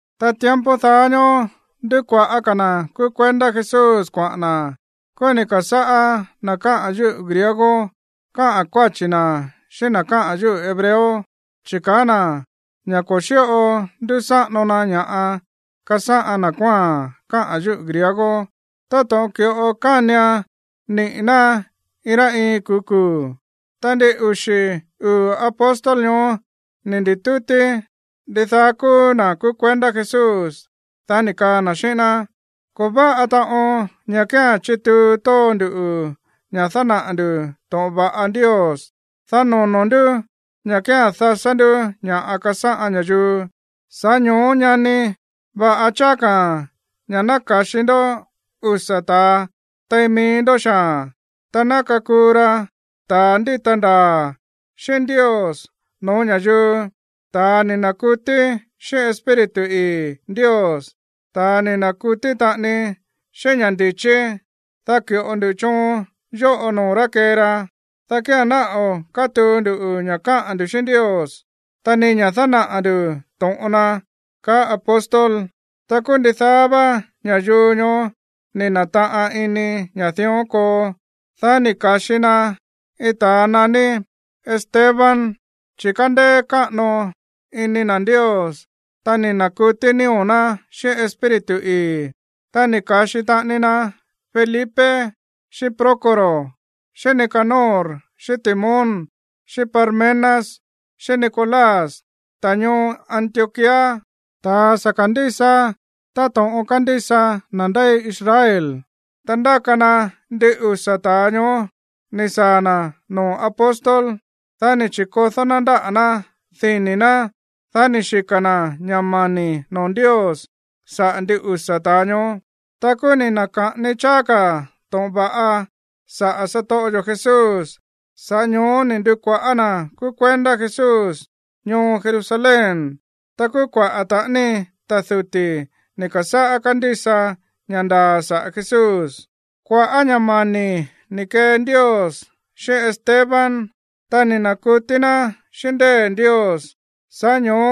Ta tiempo daá ñóó ndúkuaꞌa̱ ka̱ na̱ kúú kuendá Jesús kuaꞌa̱n na̱. Kúú ni̱ ka̱sáꞌá na̱ káꞌa̱n yúꞌu̱ griego káꞌa̱n kuáchi̱ na̱ xíꞌín na̱ káꞌa̱n yúꞌu̱ hebreo. Chi̱ kaá na̱ ña̱ ko̱ xíꞌo ndúsáꞌano na ña̱ꞌa kasáꞌan na̱ kuáa̱n káꞌa̱n yúꞌu̱ griego táto̱ꞌon ki̱ꞌo kánian niꞌi̱ ná iin rá iin kuu̱ kuu̱. Ta ndin uxi̱ uu̱ apóstol ñoó ni̱ ndi̱tútí ndidaá kúú na̱ kúú kuendá Jesús. Dá ni̱ kaa na̱ xíꞌín ná: ―Ko̱ váꞌa taꞌon ña̱ kía̱n chituu tóo nduꞌu̱ ña̱ dánaꞌa̱ ndu̱ to̱ꞌon va̱ꞌa Ndios, dá nono̱ ndú ña̱ kía̱n dasá ndú ña̱ꞌa kasáꞌan ña̱yuu. Sa̱ꞌá ño̱ó, ñani, va̱ꞌa cháá ka̱ ña̱ ná ka̱xi ndó usa̱ ta̱a tein mií ndó xaa̱n, ta ná kakuu ra ta̱a ndíta ndaa̱ xíꞌín Ndios no̱ó ña̱yuu, ta̱a ni̱ na̱kutí xíꞌín Espíritu ii̱ Ndios, ta̱a ni̱ na̱kutí taꞌani xíꞌín ña̱ ndi̱chí. Dá ki̱ꞌo ndu choon yóꞌo noo̱ rá kee ra, dá kía̱n ná o̱ kátuu ndu ña̱ káꞌa̱n ndu̱ xíꞌín Ndios, ta ni ña̱ dánaꞌa̱ nduꞌu̱ to̱ꞌon na ―kaá apóstol. Ta kúú ndidaá vá ña̱yuu ñoó ni̱ na̱taꞌan ini ña̱ dión koo. Dá ni̱ ka̱xi na iin ta̱a naní Esteban, chi̱ kándéé káꞌano iní na̱ Ndios, ta ni̱ na̱kutí nío̱ ná xíꞌín Espíritu ii̱. Ta ni̱ ka̱xi taꞌani na Felipe, xíꞌín Prócoro, xíꞌín Nicanor, xíꞌín Timón, xíꞌín Parmenas, xíꞌín Nicolás, ta̱a ñoo Antioquía, ta̱a sa̱ ka̱ndísa táto̱ꞌon kándísa na̱ ndéi Israel. Dá ndáka na ndin usa̱ ta̱a ñoó ni̱ saa̱ na̱ noo̱ apóstol. Dá ni̱ chi̱kodó ná ndáꞌa̱ ná dini̱ ná. Dá ni̱ xika̱ na̱ ña̱ mani̱ noo̱ Ndios saꞌa̱ ndin usa̱ ta̱a ñoó. Ta kúú ni̱ na̱ka̱ꞌani cháá ka̱ to̱ꞌon va̱ꞌa saꞌa̱ satoꞌo yo̱ Jesús, sa̱ꞌá ño̱ó ni̱ ndu̱kuaꞌa̱ na̱ kúú kuendá Jesús ñoo Jerusalén. Ta kúú kuaꞌa̱ taꞌani ta̱ duti̱ ni̱ ka̱sáꞌá kándísa ña̱ ndaa̱ saꞌa̱ Jesús. Kua̱ꞌá ña̱ mani̱ ni̱ kee Ndios xíꞌín Esteban, ta ni̱ na̱kutí ná xíꞌín ndée̱ Ndios, sa̱ꞌá ño̱ó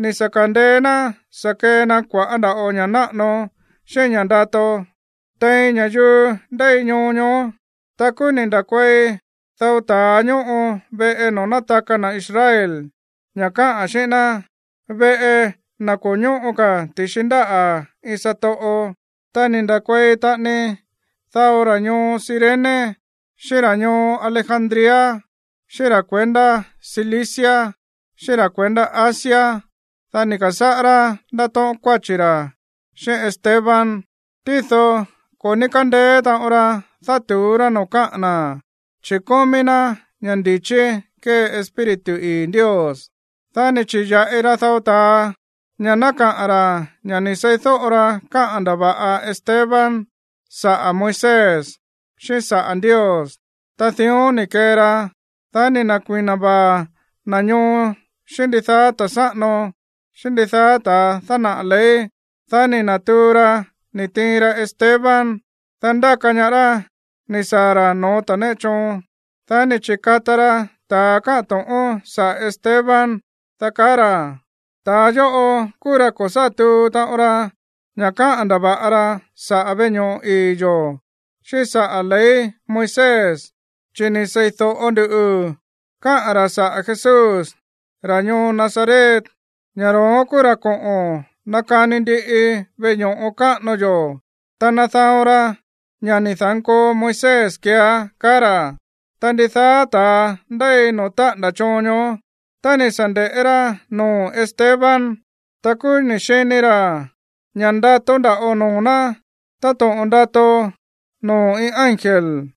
ni̱ sa̱ ka̱ndeé ná sa̱ kee na kua̱ꞌá nda̱ꞌo ña̱ náꞌano xíꞌín ña̱ ndato tein ña̱yuu ndéi ñoo ñoó. Ta kúú ni̱ nda̱kuei dao ta̱a ñóꞌo veꞌe noo̱ nátaka na̱ Israel, ña̱ káꞌa̱n xíꞌín ná, veꞌe na̱ ko̱ ñóꞌo ka̱ ti̱xi ndáꞌa̱ iin satoꞌo, ta ni̱ nda̱kuei taꞌani dao ra̱ ñoo Cirene, xíꞌín ra̱ ñoo Alejandría, xíꞌín ra̱ kuendá Cilicia, xíꞌín ra̱ kuendá Asia. Dá ni̱ ka̱sáꞌá rá ndátóꞌón kuáchi̱ ra̱ xíꞌín Esteban. Tído ko̱ ní kándeé taꞌon ra dátu̱ú rá noo̱ káꞌa̱n na̱, chi̱ kómí ná ña̱ ndi̱chí kée Espíritu ii̱ Ndios. Dá ni̱ chi̱ya̱ꞌi ra dao ta̱a ña̱ ná kaꞌa̱n ra̱ ña̱ ni̱ seídóꞌo ra káꞌa̱n ndava̱ꞌa Esteban saꞌa̱ Moisés, xíꞌín saꞌa̱ Ndios. Ta dión ni̱ kee ra, dá ni̱ na̱kui̱na vaa̱ na̱ ñoo xíꞌín ndidaá ta̱ sáꞌano, xíꞌín ndidaá ta̱ dánaꞌa̱ ley. Dá ni̱ na̱tuu ra ni̱ tiin ra Esteban. Dá ndáka ñaá rá ni̱ saa̱ ra̱ no̱ó ta̱ néꞌe choon. Dá ni̱ chi̱kata ra ta̱a káꞌa̱n to̱ꞌón saꞌa̱ Esteban, dá kaa ra̱: ―Ta̱a yóꞌo kúú ra̱ ko̱ sá tuu taꞌon ra ña̱ káꞌa̱n ndava̱ꞌa ra saꞌa̱ veꞌe ño̱ꞌo ii̱ yo̱, xíꞌín saꞌa̱ ley Moisés. Chi̱ ni̱ sei̱do̱ꞌo nduꞌu̱ káꞌa̱n ra̱ saꞌa̱ Jesús, ra̱ ñoo Nazaret, ña̱ ro̱ón kúú ra̱ koꞌo̱n nakani ndiꞌi veꞌe ño̱ꞌo káꞌano yó, ta nadaon ra ña̱ ni̱ da̱nkoo Moisés keeá ―kaá ra̱. Ta ndidaá ta̱a ndéi no̱ó táꞌa̱nda̱ choon ñoó, tá ni̱ sa̱ nde̱ꞌé rá noo̱ Esteban, ta kúú ni̱ xini ra̱ ña̱ ndato nda̱ꞌo noo̱ ná táto̱ꞌon ndato noo̱ iin ángel.